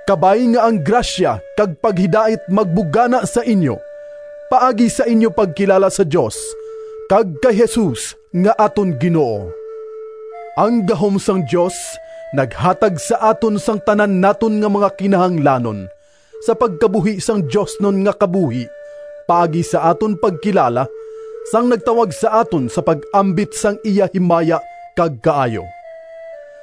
Kabay nga ang grasya kag paghidait magbugana sa inyo, paagi sa inyo pagkilala sa Dios kag kay Jesus nga aton Ginoo. Ang gahom sang Dios naghatag sa aton sang tanan naton nga mga kinahanglanon sa pagkabuhi sang diosnon nga kabuhi paagi sa aton pagkilala sang nagtawag sa aton sa pag-ambit sang iya himaya kag kaayo.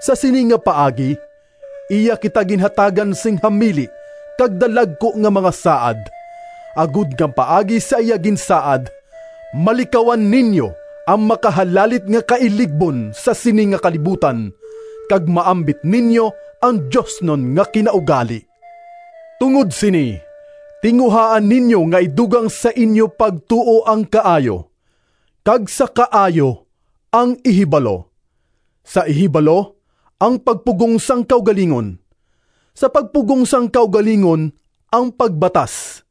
Sa sini nga paagi, iya kita ginhatagan sing hamili kag dalagku nga mga saad, agod nga paagi sa iya ginsaad, malikawan ninyo ang makahalalit nga kailigbon sa sini nga kalibutan, kag maambit ninyo ang diosnon nga kinaugali. Tungod sini, tinguhaa ninyo nga idugang sa inyo pagtuo ang kaayo, kag sa kaayo ang ihibalo, sa ihibalo ang pagpugong sang kaugalingon, sa pagpugong sang kaugalingon ang pagbatas,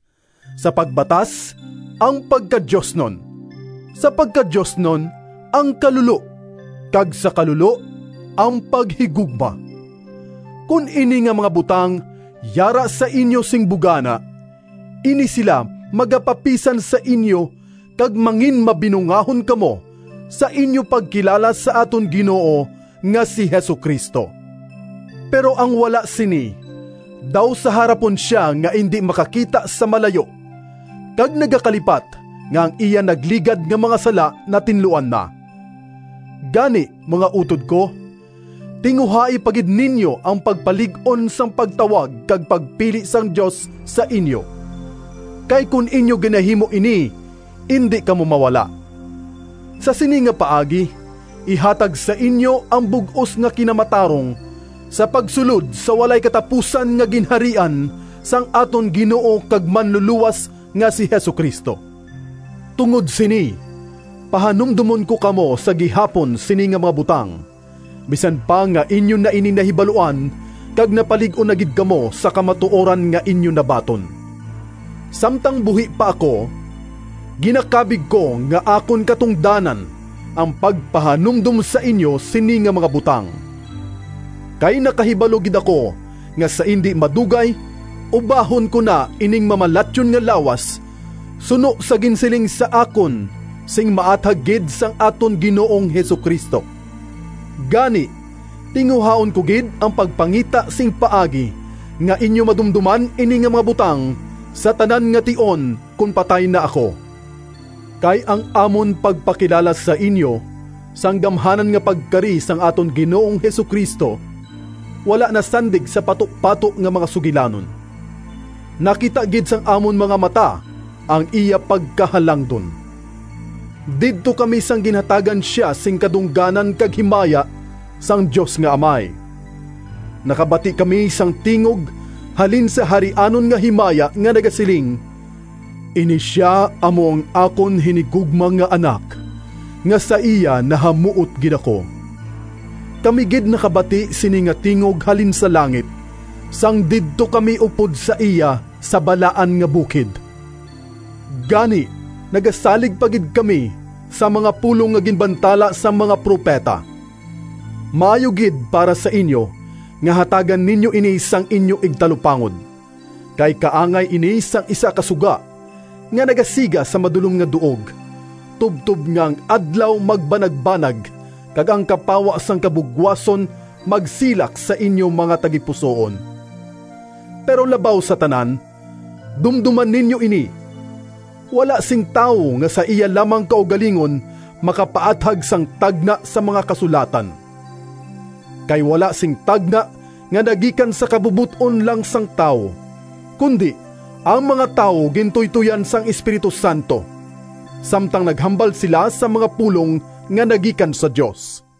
sa pagbatas ang pagkadiosnon, sa pagkadiosnon ang kalulo, kag sa kalulo ang paghigugma. Kon ini nga mga butang yara sa inyo sing bugana, ini sila magapapisan sa inyo kag manginmabinungahon kamo sa inyo pagkilala sa aton Ginoo nga si Jesu-Cristo. Pero ang wala sini daw sa harapon sia nga indi makakita sa malayo, kag nagakalipat nga ang iya nagligad nga mga sala natinluan na. Gani, mga utod ko, tinguhai pa gid ninyo ang pagpalig-on sang pagtawag kag pagpili sang Dios sa inyo, kay kon inyo ginahimo ini indi kamo mawala. Sa sini nga paagi, ihatag sa inyo ang bug-os nga kinamatarong sa pagsulod sa walay katapusan nga Ginharian sang aton Ginoo kag Manlulowas nga si Jesu-Cristo. Tungod sini, pahanumdomon ko kamo sa gihapon sini nga mga butang, bisan pa nga inyo na ini nahibaluan kag napalig-on na gid kamo sa kamatuoran nga inyo nabaton. Samtang buhi pa ako, ginakabig ko nga akon katungdanan ang pagpahanumdom sa inyo sini nga mga butang. Kay nakahibalo gid ako nga sa indi madugay ubahon ko na ining mamalatyon nga lawas, suno sa ginsiling sa akon sing maathag gid sang aton Ginoong Jesu-Cristo. Gani, tinguhaon ko gid ang pagpangita sing paagi nga inyo madumdoman ini nga mga butang sa tanan nga tion kon patay na ako. Kay ang amon pagpakilala sa inyo sang gamhanan nga pagkari sang aton Ginoong Jesu-Cristo wala nasandig sa patupato nga mga sugilanon. Nakita gid sang amon mga mata ang iya pagkahalangdon! Didto kami sang ginhatagan sia sing kadungganan kag himaya sang Dios nga Amay. Nakabati kami sang tingog halin sa Harianon nga Himaya nga nagasiling, “Ini sia amo ang akon hinigugma nga Anak, nga sa iya nahamuot gid ako!” Kami gid nakabati sini nga tingog halin sa langit, sang didto kami upod sa iya sa balaan nga bukid. Gani nagasalig pa gid kami sa mga pulong nga ginbantala sang mga propeta. Maayo gid para sa inyo nga hatagan ninyo ini sang inyo igtalupangod, kay kaangay ini sang isa ka suga nga nagasiga sa madulom nga duog, tubtob nga ang Adlaw magbanagbanag kag ang kapawa sang kabugwason magsilak sa inyo mga tagipusoon. Pero labaw sa tanan, dumdoma ninyo ini: wala sing tawo nga sa iya lamang kaugalingon makapaathag sang tagna sa mga Kasulatan. Kay wala sing tagna nga nagikan sa kabubot-on lang sang tawo, kundi ang mga tawo gintuytoyan sang Espiritu Santo, samtang naghambal sila sang mga pulong nga nagikan sa Dios.